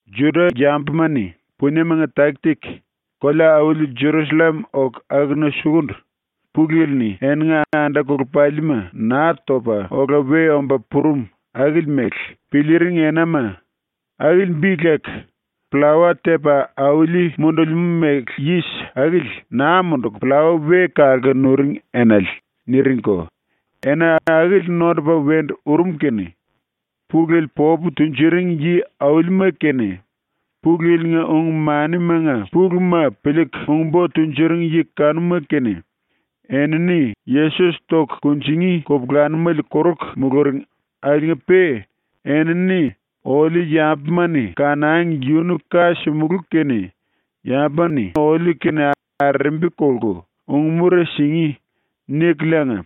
⸤Juda-yambuma-ni puniemanga taki-taki kolea-auli Jerusallem oku akuna sukundu⸥ Pulu Yili-ni eninga anda-kolepalima Naa Topa Ola We Omba Purum akili mele piliiring enama, akili bi leku ‘Pllawa Tepa Auli Mundulimú Méle Yis Akili Naa Munduku Pllawa We Kalku Nuring Enale’ niringko, ena akili nondupa wendu urum kene Pulu Yili popu tunjuring yi-aulima kene, Pulu Yili-nga ung-manimanga puluma piliiku ung-bo tunjuring yi kanuma kene, enini Yesos toku kunjingí kupulanumele koruku muluring akiliinga-pe enini “Oliu yambuma-ni kanangi yunu ka simulú kene yambuma-ni oliu-kene arerembi kolku ung-mura singí.” nikuliinga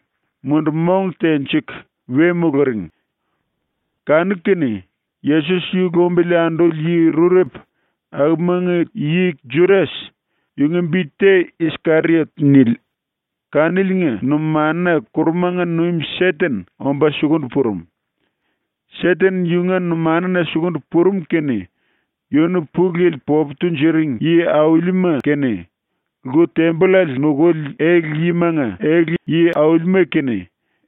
mundu-mong tenjiku we muluring. Kanu-kene Yesos yu lumbili anduli yi rurepu akumanga yi Judas, yunga bi te ‘Iskeriot’ nili, kaniliinga numanuna ⸤kurumanga nuim⸥ Seten omba sukundu purum. ⸤Seten yunga numanuna sukundu purum⸥ kene yunu Pulu Yili popu tunjuring yi-aulima kene, lku-tembollale nukuli ele-yimanga ele-yi aulima kene,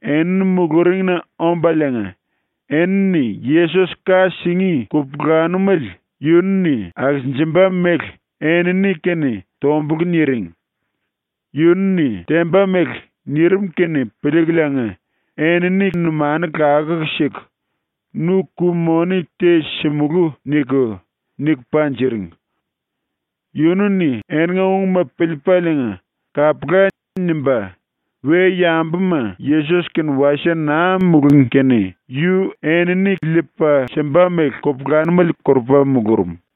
enini muluringna ombaliinga, enini Yesos ka singí kupulanumele yunu-ni akisinjimba mele enini-kene tombulku niring. Yunu-ni temba mele nirim kene piliikuliinga enini numanu lakuku siku “Nu ku-moni te simulú.” niku, niku panjiringi. Yunu-ni eninga ungma piliipaliinga “Kapula.” nimba, we-yambuma Yesos-kene wasie naa mulungí kene yu enini liipa simba mele kupulanumele korupa mulurum.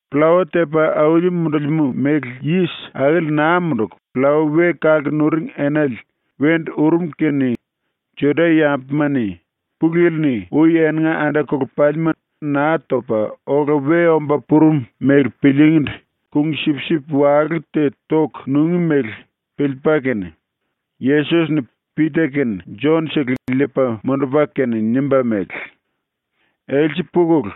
Pllawa Tepa Auli Mundulimú Méle Yis Akili Naa Munduku Pllawa We Kalku Nuring Enale wendu urum kene Juda-yambuma-ni Pulu Yili-ni ui eninga anda-kolepalima Naa Topa Ola We Omba Purum mele piliingíndu kung-sipsip walú te toku nungí mele piliipa kene, Yesos-ni Pita kene Jon-sele liipa mundupa kene nimba mele: “Else pukulu,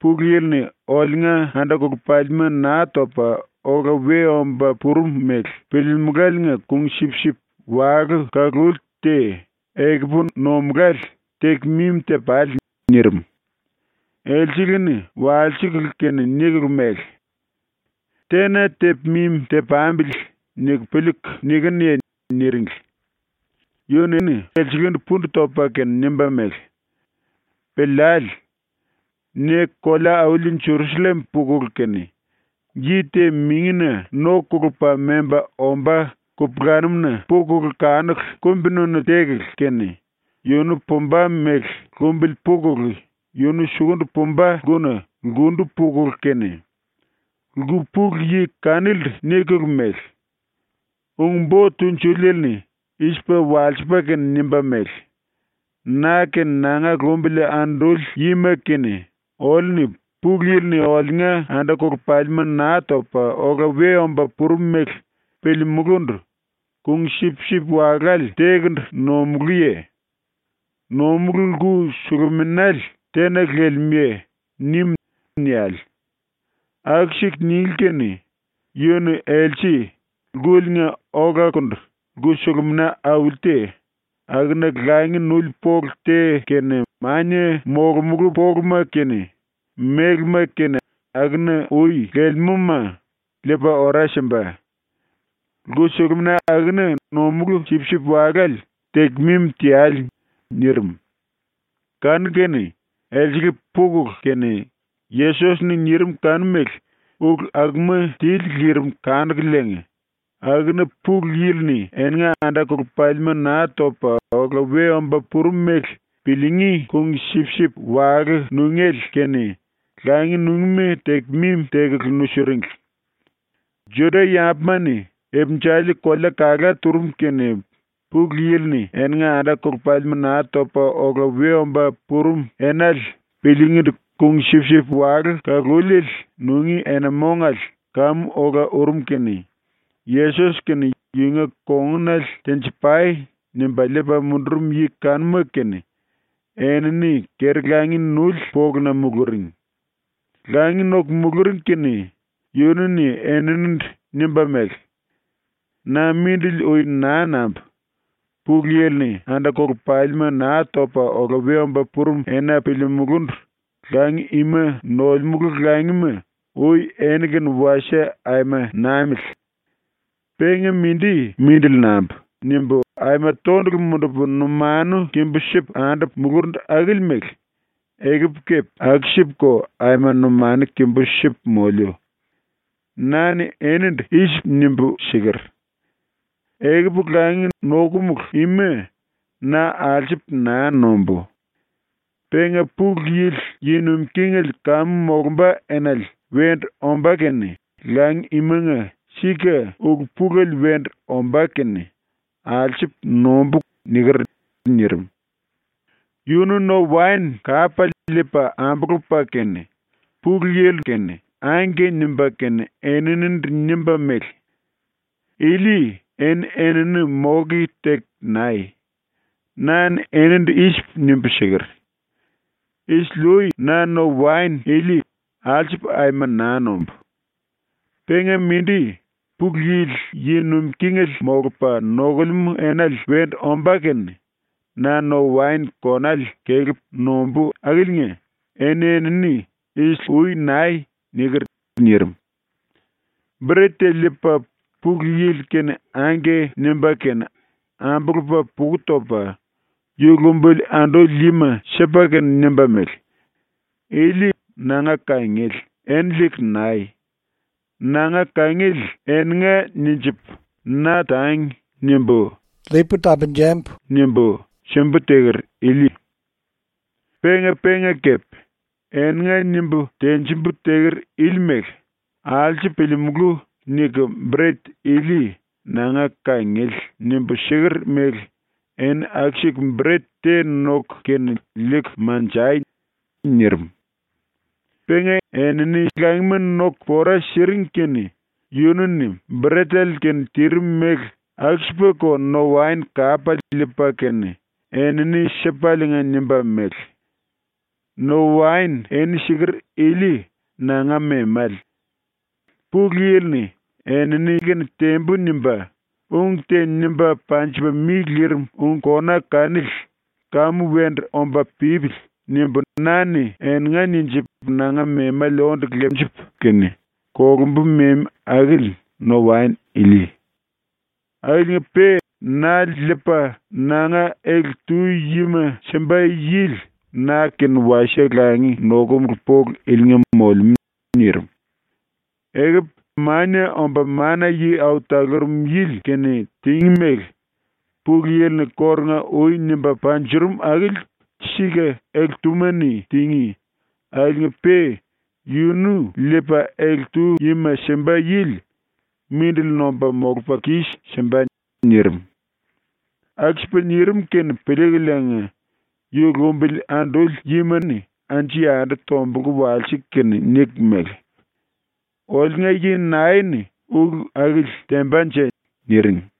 Pulu Yili-ni oliunga anda-kolepalima Naa Topa Ola We Omba Purum mele piliimuláliinga kung-sipsip walú ⸤kaluli⸥ te ekupu nomulále teku mimi te-pale.” nirim. Elsele-ni walsikulu kene nikulu mele: “Tena tepu mimi te-pambili niku piliiku nikinuye?” niringli. Yunu-ni elselendu pundu topa kene nimba mele: “Piliale. Ne kolea-auli ⸤Jerusallem⸥ pukulu kene, yi te mingina no kolupa memba ombá kupulanum-na pukulu kanuku kumbi-nunu tekulu kene, yunu pumba mele lumbili pukulu yunu sukundu pumba lkuna lkundu pukulu kene lku pulu yi kanilindu nikulu mele: “Ung-Bo Tunjuliele-ni i-sipa walsipa kene nimba mele: “Na kene nanga lumbili anduli yima kene oliu-ni Pulu Yili-ni oliunga anda-kolepalima Naa Topa Ola We Omba Purum mele piliimulúndu kung-sipsip walále tékundu nomulúye? Nomulú lku-suluminale tena lelemúye?” nim.” niale. Aku-siku ninglí kene yu-ni else lkuliinga olakundu lku-sulumina auli te, akuna langi nuli polu te kene, mania molomulú poluma kene, mélema kene akuna ui lelemúma, liipa ora simba. Lku-sulumina akuna ⸤nomulú sipsip-walále⸥ teku mimi teale.” nirim. Kanu-kene elsele pukulu kene, Yesos-ni nirim kanu mele ulu akuma tili lirim kanukululiinga, akuna Pulu Yili-ni eninga anda-kolepalima Naa Topa Ola We Omba Purum mele piliingí kung-sipsip walú nungéle kene langi nungíma teku mimi tekulu nusiringli. Juda-yambuma-ni ipinjali kolea kalá turum kene Pulu Yili-ni eninga anda-kolepalima Naa Topa Ola We Omba Purum Enale piliingíndu kung-sipsip walú ⸤kaluliele⸥ nungí ena-mongale kamu ola urum kene, Yesos kene yunga kongunale ‘tenji-pai.’ nimba liipa mundurum yi kanuma kene enini keri-langi nuli poluna muluring. Langi noku muluring kene yunu-ni eninindu nimba mele: “‘Na mindili ui naa nambu. Pulu Yili-ni anda-kolepalima Naa Topa Ola We Omba Purum ena piliimulúndu langi ima nolemulu langima ui eni-kene wasie aima namili! Penga mindi mindili nambu.’ nimbu aima tondulu mundupu numanu kimbú sipu andupu mulurundu akili mele ekupu kepe aku-sipuko aima numanu kimbú sipu moliu. Na-ni enindu i-sipu nimbu siker: ‘Ekupu langi nokomulu ima na alsupu naa nombú. Penga Pulu Yili yi nuim kingele kamu molumba enale wendu omba kene langi imanga sika ulu-pulele wendu ombá kene alsupu nombú.’ niker.” nirim. Yunu no-waen kapale liipa ambulupa kene Pulu Yili-ndu “Angke” nimba kene eninindu nimba mele: “Ili eni-enini moke teku nai. Na-ni enindu i-sipu nimbu siker: “Isili-ui na no-waen ili alsupu aima naa nombú. Penga mindi, Pulu Yili yi nuim kingele molupa nokulemú enale wendu ombá kene na no-waen konale kelepu nombú akiliinga ⸤eni-enini isili-ui nai⸥.” niker.” nirim. Bret te liipa Pulu Yili-kene “Angke” nimba kene ambulupa puka topa ⸤yu lumbili anduli yima⸥ sipa kene nimba mele: “Ili nanga kangiele ⸤eni liiku nai⸥. Nanga kangiele ‘eninga’ ninjipu ⸤‘Na tangi.’ nimbu⸥ simbu teker ili. Penga-penga kepe, ‘eninga’ nimbu tenjimbu teker akili mele ‘Alsupu piliimulú.’ niku bret ili “Nanga kangiele.” nimbu siker mele eni aku-siku bret te noku kene liiku manjai.” nirim. Penga enini langima noku pora siring kene yunu-ni ⸤bretele-kene tirim mele⸥ aku-sipako no-waen kapale liipa kene ⸤enini sipaliinga⸥ nimba mele: “No-waen ⸤eni siker⸥ ili nanga memale. ⸤Pulu Yili-ni ‘Enini-kene tembu.’ nimba,⸥ ung te nimba panjipa mi lirim ung kona kanili ‘Kamu wendu omba pípili.’ nimbu na-ni eninga ninjipu nanga memale onde lepu kene ⸤kolumbu⸥ memi akili no-waen ili. “Akiliinga-pe na liipa nanga ele-tu yima simba yili na-kene wasie langi nokomulu polu ilinga molemú.” nirim. “Ekupu Mania Omba Mana-Yi Au Talurum Yili kene tingí mele Pulu Yili-ni kórunga-ui nimba panjurum akili sika ele-túma-ni tingí, akiliinga-pe yunu liipa ele-tu yima simba yili mindili nomba molupa kis-simba.” nirim. Aku-sipa nirim kene piliikuliinga ⸤yu lumbili anduli yima-ni⸥ anju-yandu tombulku walsiku kene niku mele: “Oliunga yi nae-ni ulu akili tembanje?” niring.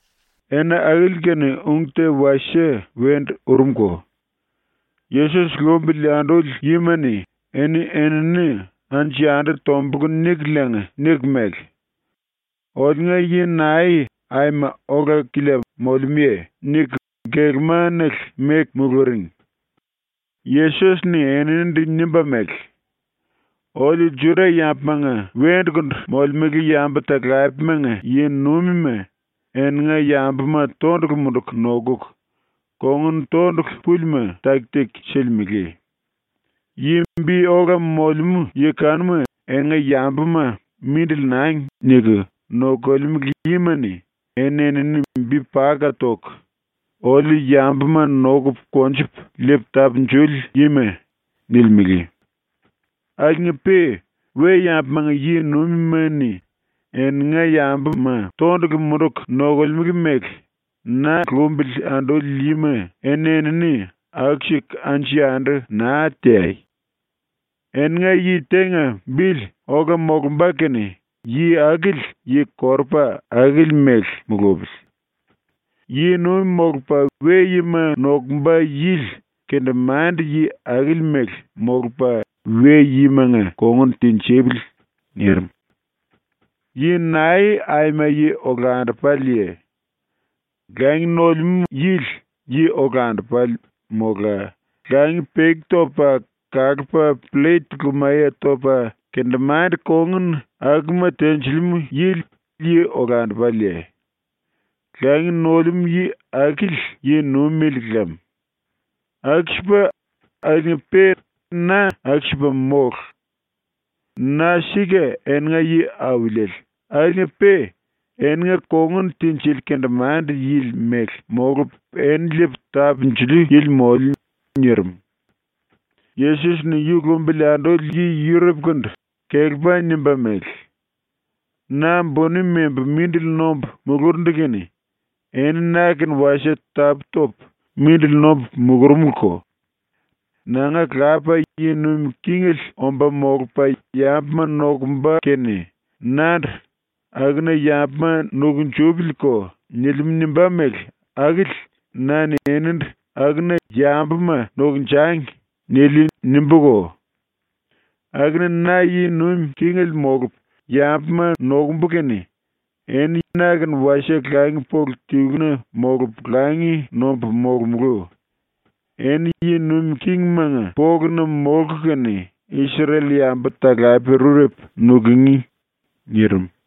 Ena akili kene ung te wasie wendu urumko. ⸤Yesos lumbili anduli yima-ni⸥ eni-enini anju-yandu tombulku nikuliinga niku mele: “Oliunga yi nae aima ola-kilia molemúye?” niku gelema-nele meku muluring. Yesos-ni eninindu nimba mele: “Oliu Juda-yambumanga wendukundu molemele yambu-talapemanga yi-nuimima eninga yambuma tondulu munduku nokuku kongun tondulu púlima taki-taki silimele. Yi bi ola molemú yi kanuma eninga yambuma ‘Mindili nangi.’ niku nokolemele yima-ni eni-enini bi paka toku, “Oliu yambuma nokupu konjupu liipu tapunjuli yima.” nilimele. Akiliinga-pe ⸤we-yambumanga yi-nuimima-ni eninga yambuma tondulu munduku nokolemele mele na lumbili anduli yima⸥ eni-enini aku-siku anju-yandu naa teai. Eninga yi tenga bili ola molumba kene yi akili yi-korupa akili mele mulupili. Yi-nuim molupa we-yima nokumba yili kendemande-yi akili mele molupa we-yimanga kongun tinjipili.” ⸤nirim⸥. “Yi nae aima yi olandupaleye? Langi nolemú yili yi olandupale mola langi peki topa kalupa pllet lumaye topa kendemande-kongun akuma tenjilimú yili yi olandupaleye? Langi nolemú yi akili yi-nuimele lem. Aku-sipa, akiliinga-pe na aku-sipa mólu. Na ⸤sika eninga yi-auliele⸥ akiliinga-pe eninga kongun tinjili kendemande-yili mele molupu eni liipu tapunjuli yili moliu.” ⸤nirim.⸥ ⸤Yesos-ni yu lumbili anduli ⸤yi⸥ rurepukandu kelepa nimba mele:⸥ “Na buni membu mindili nombu mulurundu kene eni na-kene wasie tapú-topu mindili nombu mulurumuluko. Nanga Lapa yi nuim kingele omba molupa yambuma nokumba kene nandu ‘Akuna yambuma nukunjupiliko.’ nilimú nimbá mele akili na-ni enindu ‘Akuna yambuma nokunjangi.’ niliu nimbúko. Akuna na yi nuim kingele molupu yambuma nokumbu kene eni na-kene wasie langi-polu tiluna molupu langi nombu molomulú. Eni yi nuim kingismanga poluna molku kene Isrel-yambu talape rurepu nukungí.” ⸤nirim.⸥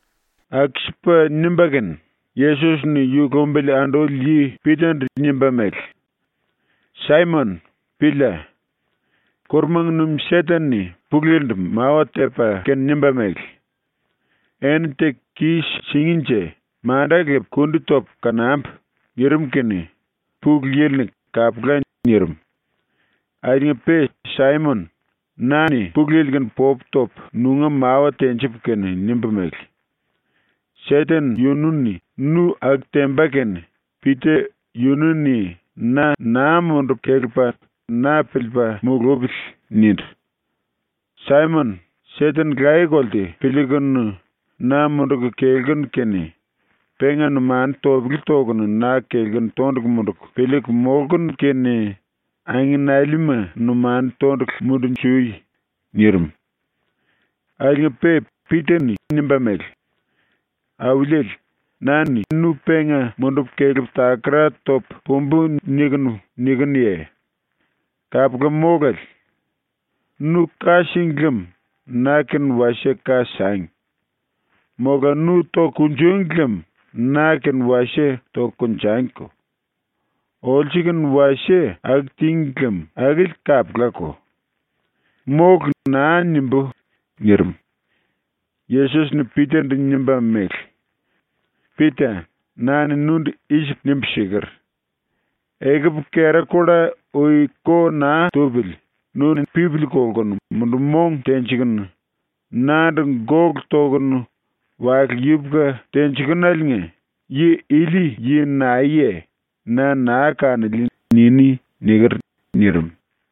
⸤Aku-sipa nimba kene, Yesos-ni yu lumbili anduli yi Pita-ndu nimba mele:⸥ “Saimon, pília! ⸤Kurumanga nuim⸥ Seten-ni Pulu Yili-ndu mawa tepa kene nimba mele: “Eni teku kis-singínje manda lepu kundi topu kanambu.” nirim kene Pulu Yili-ni “Kapula.” nirim. Akiliinga-pe Saimon, na-ni Pulu Yili-kene popu topu nunga mawa tenjipu kene nimbu mele: “Seten yunu-ni nu aku temba kene Pita yunu-ni na naa mundupa kelepa na piliipa mulupili.” nindu. Saimon, Seten laye-kolte piliikunu na munduku kelkunu kene, penga numanu topele tokunu na kelkunu tondulu munduku piliiku molkunu kene angenalima numanu tondulu mundunjui.” nirim. Akiliinga-pe Pita-ni nimba mele: “Auliele, na-ni nu penga mundupu kelepu takara topu pumbu nikunu nikinuye? Kapula mólale. Nu ka síngi lem na-kene wasie ka sangi. Mola nu toku kunjúngi lem na-kene wasie toku konjangiko. Olsu-kene wasie aku tíngi lem akili kapulako. ‘Mólu.’ naa nimbú.” nirim. Yesos-ni Pita-ndu nimba mele: “Pita, na-ni nundu i-sipu nimbu siker: “Ekupu kera-kulla ui ko naa tupili nu-ni pipili kolkunu mundu-mong tenjikunu nandu gólu tokunu wale yupuku tenjikunuliinga “Yi ili yi naeye? Na naa kanoliu.” niní.” niker.” nirim.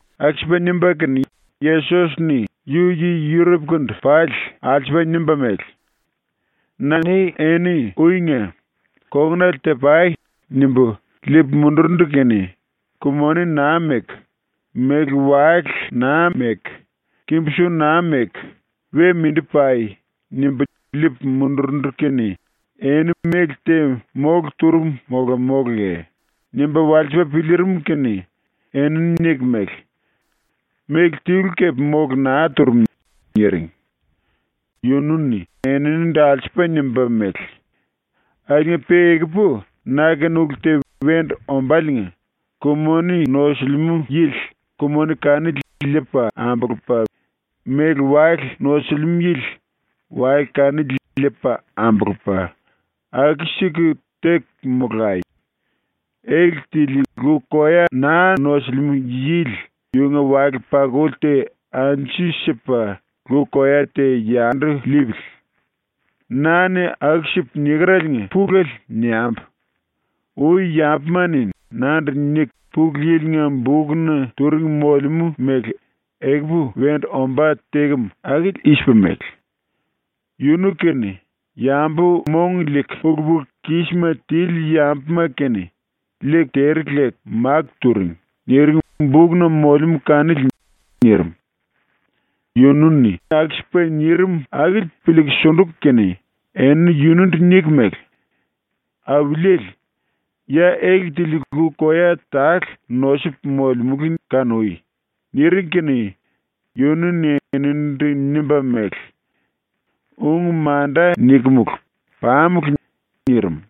Aku-sipa nimba kene Yesos-ni yu yi ⸤rurepukandu⸥ pali alsupa nimba mele: “Na-ni eni uinga ⸤‘Kongunele ti-pai.’ nimbu⸥ liipu mundurundu kene ‘Ku-moni naa meku, méle-wale naa meku, kimbu-su naa meku, we mindi pai.’ nimbu liipu mundurundu kene eni méle te mólu turum mola móluye?” nimba walsipa piliirim kene enini niku mele: “Méle tilu kepe mólu naa turum.” niring. Yunu-ni eninindu alsupa nimba mele: “Akiliinga-pe ekupu na-kene ulu te wendu ombáliinga, ku-moni nosilimú yili ku-moni kanili liipa ambulupa, méle-wale nosilimú yili wale kanili liipa ambulupa, aku-siku teku molai. Ele tili lu-koya naa nosilimú yili yunga wale-pakuli te anju sipa lu-koya te yandu liipili. ⸤Na-ni aku-sipu nikereliinga pulele niambu:⸥ Ui yambuma-ni nandu niku Pulu Yili-nga bukna turing molemú mele ekupu wendu ombá tekem akili i-sipa mele: “Yunu kene, yambu mong liiku ulu-pulu-kísima tili yambuma kene, liiku tere leku makó turing.” niring bukna molemú kanili.” nirim. Yunu-ni aku-sipa nirim akili piliiku sunduku kene enini yunundu niku mele: “Auliele, ya ele tili lu-koya tale nosupu molemulu kanui.” niring kene yunu-ni eninindu nimba mele: “Ung manda nikimulu, ⸤pamulu.⸥” nirim.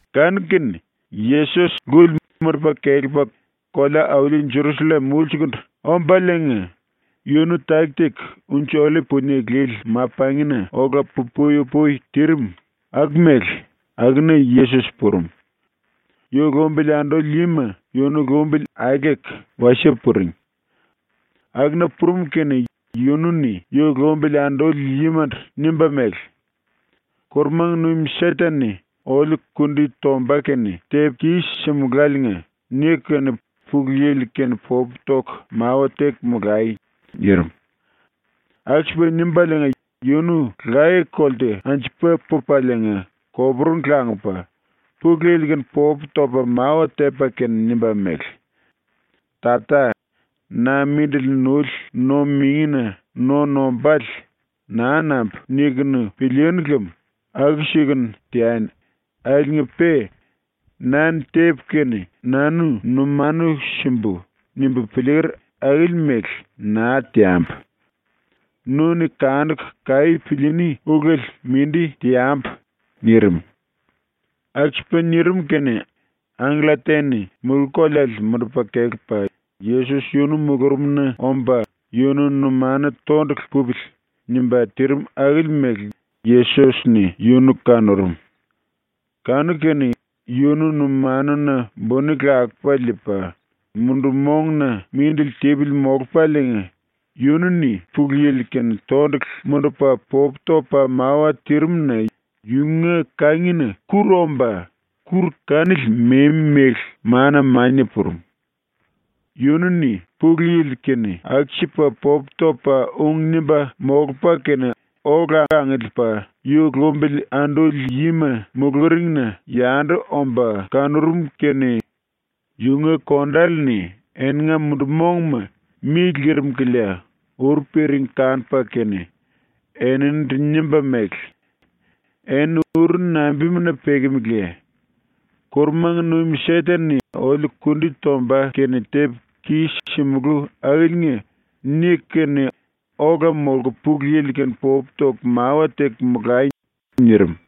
Kanu-kene Yesos ⸤lkuli mundupa kelepa kolea-auli Jerusallem⸥ ulsukundu ombaliinga yunu taki-taki Unji-Ollip-Punie Lili Ma-Pangina ola pu-pui-upui tirim aku mele akuna Yesos purum. Yu lumbili anduli yima yunu lumbili aeleku wasie puring. Akuna purum kene yunu-ni yu lumbili anduli yimandu nimba mele: “⸤Kurumanga nuim⸥ Seten-ni ‘Oliu kundi tomba kene tepu kis-simuláliinga’ niku kene Pulu Yili-kene popu toku mawa teku molai.” nirim. Aku-sipa nimbaliinga yununu laye-kolte anjupa pupaliinga koporungu langupa, Pulu Yili-kene popu topa mawa tepa kene nimba mele: “Tata, na ⸤mindili nuli⸥ no-mingina no nombále ‘Naa nambu.’ nikunu pilíínu lem aku-sikunu teani akiliinga-pe ‘Na-ni tepu kene nanu numanu simbu.’ nimbu piliiker akili mele naa teambu. Nu-ni kanukunu kaí piliiní ulele mindi teambu.” nirim. Aku-sipa nirim kene angkella te-ni mulú-koleale mundupa kelepa Yesos yunu mulurumna omba ‘Yunu numanu tondulu pupili.’ nimba tirim akili mele Yesos-ni yunu kanurum. Kanu-kene yunu numanuna buni lakupa liipa, mundu-monguna mindili tipili molupaliinga yunu-ni Pulu Yili-kene tondulu mundupa popu topa mawa tirim-na yunga kangina kúru omba kúru kanili memi mele mana mania purum. Yunu-ni Pulu Yili-kene aku-sipa popu topa ung nimba molupa kene ola angiliipa yu lumbili anduli yima muluringna yandu omba kanurum kene yunga kondale-ni eninga mundu-mongma mi lirim kilia uru piring kanupa kene eninindu nimba mele: “Eni uru nambimuna pekemeleye? ‘⸤Kurumanga nuim Seten-ni⸥ oliu kundi tomba kene tepu kis-simulú akiliinga’ niku kene ola molku Pulu Yili-kene popu toku mawa teku molai.” nirim.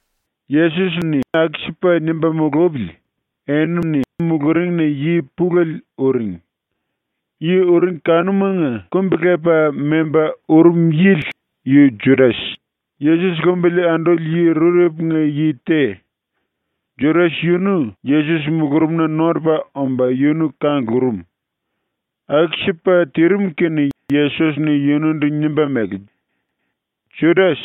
Yesos-ni aku-sipa nimba mulupili enini muluringna yi pulele uring. Yi uring kanumanga kumbi-lepa memba urum yili yu Judas, Yesos lumbili anduli yi rurepunga yi te. Judas yunu Yesos mulurumna nondupa omba yunu kanglurum. Aku-sipa tirim kene Yesos-ni yunundu nimba mele: “Judas,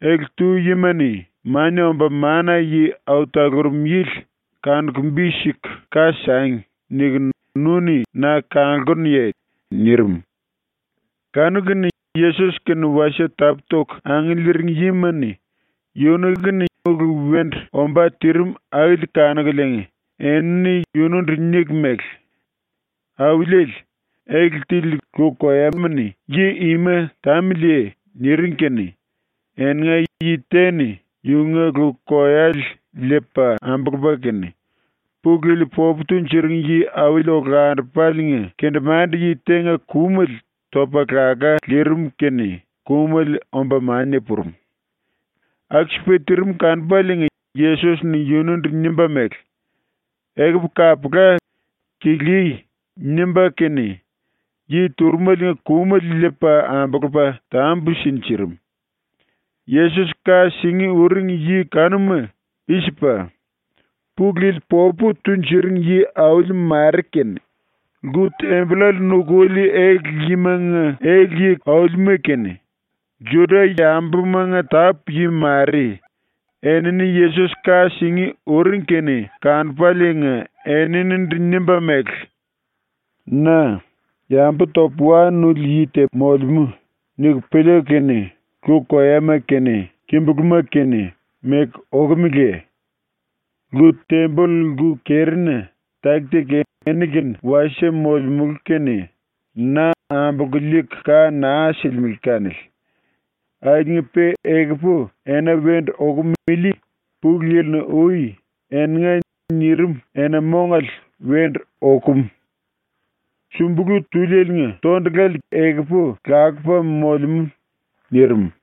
ele-tu yima-ni Mania Omba Mana-Yi Au Talurum Yili ‘kanuku bi siku ka sangi.’ nikunu nu-ni na kanglkunuye?” nirim. Kanu-kene Yesos-kene wasie tapú-toku angiliiring yima-ni yunu-kene ulu wendu ombá tirim akili kanukuliinga enini yunundu niku mele: “Auliele, ele tili lu-koyama-ni yi ima tamiliye?” niring kene eninga yi te-ni ⸤yunga lu-koyale liipa ambulupa kene⸥ Pulu Yili popu tunjuring yi-auli olandupaliinga kendemande-yi tenga kumele topa laká lirim kene kumele omba mania purum. Aku-sipa tirim kanupaliinga Yesos-ni yunundu nimba mele: “Ekupu kapula, kilíí!” nimba kene yi turumeliinga kumele liipa ambulupa tambu sinjirim. Yesos ka singí uring yi kanuma i-sipa: Pulu Yili popu tunjuring yi-auli mare kene, lku-tembollale nukuli ele-yimanga ele-yi aulima kene, Juda-yambumanga tápu-yi mare, enini Yesos ka singí uring kene kanupaliinga eninindu nimba mele: “Na ‘yambu topu wa nuli yi te molemú.’ niku piliiku kene lu-koyama kene kimbulúma kene meku okumeleye? Lku-temboll lku-kerina taki-taki eni-kene wasie molemulu kene na ambolku liiku ka naa silimele kanili. Akiliinga-pe ekupu ena wendu okum ili Pulu Yili-ni ui ‘Eninga.’ nirim ena-mongale wendu okum. Sumbulu túlieliinga tondulale kene lakupa molemú.” nirim.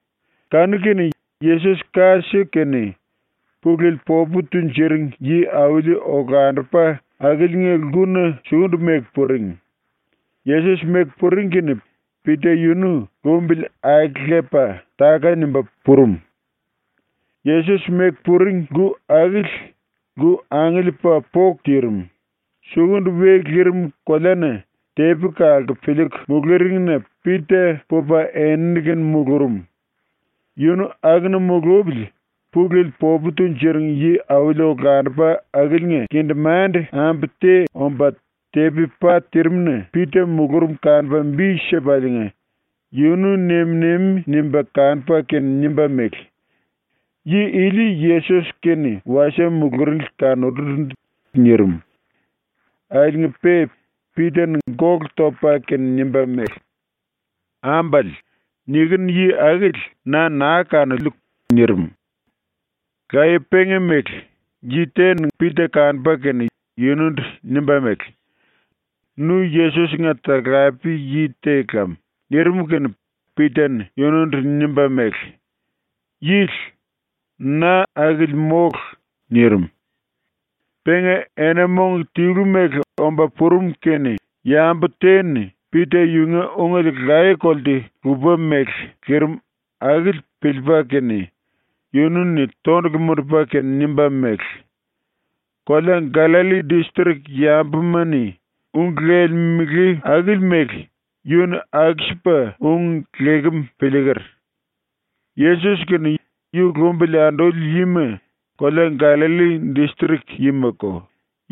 Kanu-kene Yesos ka siku kene Pulu Yili popu tunjuring yi-auli olandupa akiliinga lkuna sukundu meku puring. Yesos meku puring kene Pita yunu lumbili aelepa táka-nimba purum. Yesos meku puring lku akili lku angiliipa poku tirim, sukundu we lirim koleana tepi kalku piliiku muluringna Pita pupa enini-kene mulurum. Yunu akuna mulupili ⸤Pulu Yili popu tunjuring yi-auli olandupa akiliinga⸥ kendemande-ambu te omba tepi pa tirimna Pita mulurum kanupa bi sipaliinga yunu nem-nemi nimba kanupa kene nimba mele: “Yi ili Yesos-kene wasie muluringli kanurundu.” nirim. Akiliinga-pe Pita-ni gólu topa kene nimba mele: “Ambale, nikinu yi akili na naa kanoliu.” nirim. Laye penga mele yi te-ni Pita kanupa kene yunundu nimba mele: “Nu Yesos-nga talape-yi te lam.” nirim kene Pita-ni yunundu nimba mele: “Yili, na akili mólu.” nirim. Penga ena-mong tilu mele omba purum kene yambu te-ni ⸤Pita yunga ungele laye-kolte lupa mele lirim akili piliipa kene⸥ yunu-ni tondulu mundupa kene nimba mele: “Kolea Gallalli distrik yambuma-ni ung lelemele akili mele yunu-ni aku-sipa ung lekem piliiker. ⸤Yesos kene yu lumbili anduli yima kolea Gallalli distrik yimako,⸥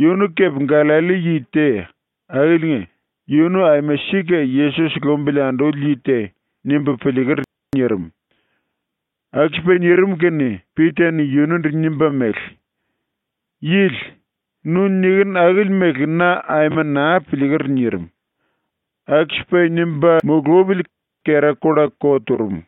yunu kepe Gallalli yi te, akiliinga ‘Yunu aima sika ⸤Yesos⸥ lumbili anduli yi te.’ nimbu piliiker.” nirim. Aku-sipa nirim kene Pita-ni yunundu nimba mele: “Yili, nu nikinu akili mele na aima naa piliiker.” nirim. Aku-sipa nimba mulupili kera-kulla ko turum.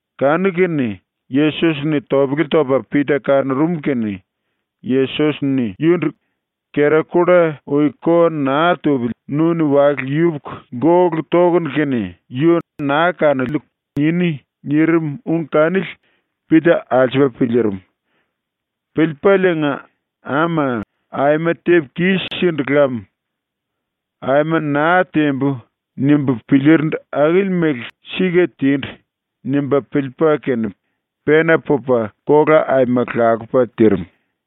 Kanu-kene Yesos-ni topele topa Pita kanurum kene Yesos-ni yundu “Kera-kulla ui ko naa tupili nu-ni wale yupuku gólu tokunu kene “Yu naa kanoliu.” niní.” nirim ung kanili Pita alsupa piliirim. Piliipaliinga ⸤‘Ama, aima tepu kis-sindu lam. ‘Aima naa tembu.’ nimbu piliirindu akili mele sika tindu.’ nimba piliipa kene⸥ pena pupa kola aima lakupa tirim.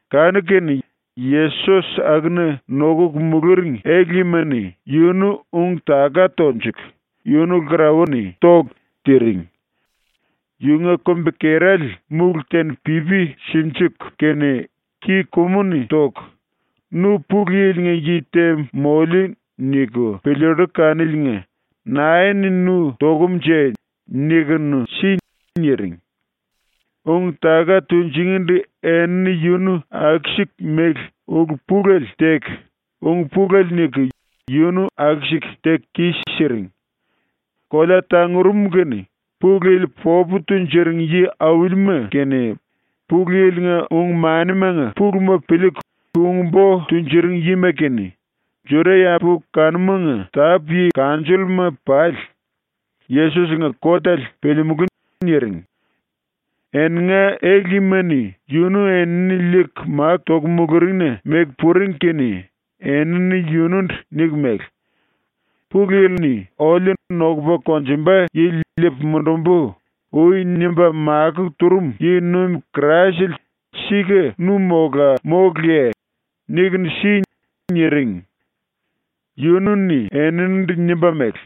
Kanu-kene Yesos akuna nokuku muluring ele-yima-ni yunu ung-taka tonjuku, yunu lkarauwa-ni toku, tiring. Yunga kumbi-kerale múlu te-ni pipi sinjiku kene ki-kumu-ni toku ⸤“Nu ‘Pulu Yili-nga yi te moliu.’ niku piliillu kaniliinga⸥ nae-ni nu tokumnje nikunu si.” niring. Ung-taka tunjingindu enini yunu aku-siku mele ulu pulele teku ung pulele niku yunu aku-siku teku kis-siring. Kolea tangurum kene Pulu Yili popu tunjuring yi-aulima kene, Pulu Yili-nga ung-manimanga puluma piliiku ung-bo tunjuring yima kene, Juda-yambu kanumanga tápu-yi kanjolluma pali ‘Yesos-nga kotele piliimulú.’ niring. ⸤Eninga ele-yima-ni⸥ yunu enini liiku máku toku muluringna meku puring kene enini yunundu niku mele: “Pulu Yili-ni oliu “Nokupa konjumba yili liipu mundumbu.” ui nimba makó turum yi-nuim Kraisele sika nu mola móluye? Nikunu si.” niring. Yunu-ni eninindu nimba mele: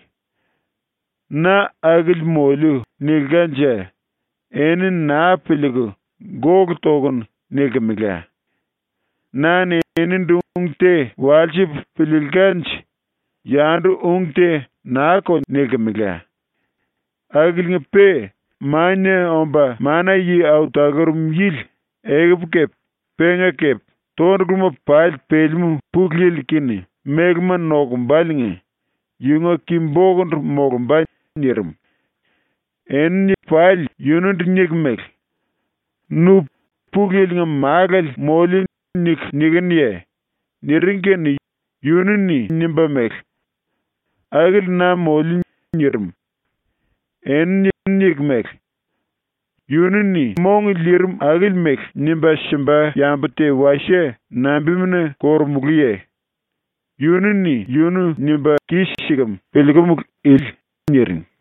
“‘Na akili moliu.’ nilkanje eni naa piliiku “Gólu tokunu.” nilkimela. Na-ni enindu ung te walsipu piliilkanje yandu ung te naa-ko nilkimela. Akiliinga-pe Mania Omba Mana-Yi Au Talurum Yili ekupu kepe penga kepe tonduluma pali pelemú Pulu Yilu⸤-kene mélema nokumbaliinga⸥ yunga ki-bokundu molumba.” nirim. Enini pali yunundu niku mele: “Nu ‘Pulu Yili-nga Málale moliu.’ niku nikinuye?” niring kene yunu-ni nimba mele: “Akili na moliu.” nirim. Enini niku mele: “Yunu-ni mong liirim akili mele nimba simba yambu te wasie nambimuna korumulúye? Yunu-ni yunu nimba kis-sikem piliikumulu ili.” niring.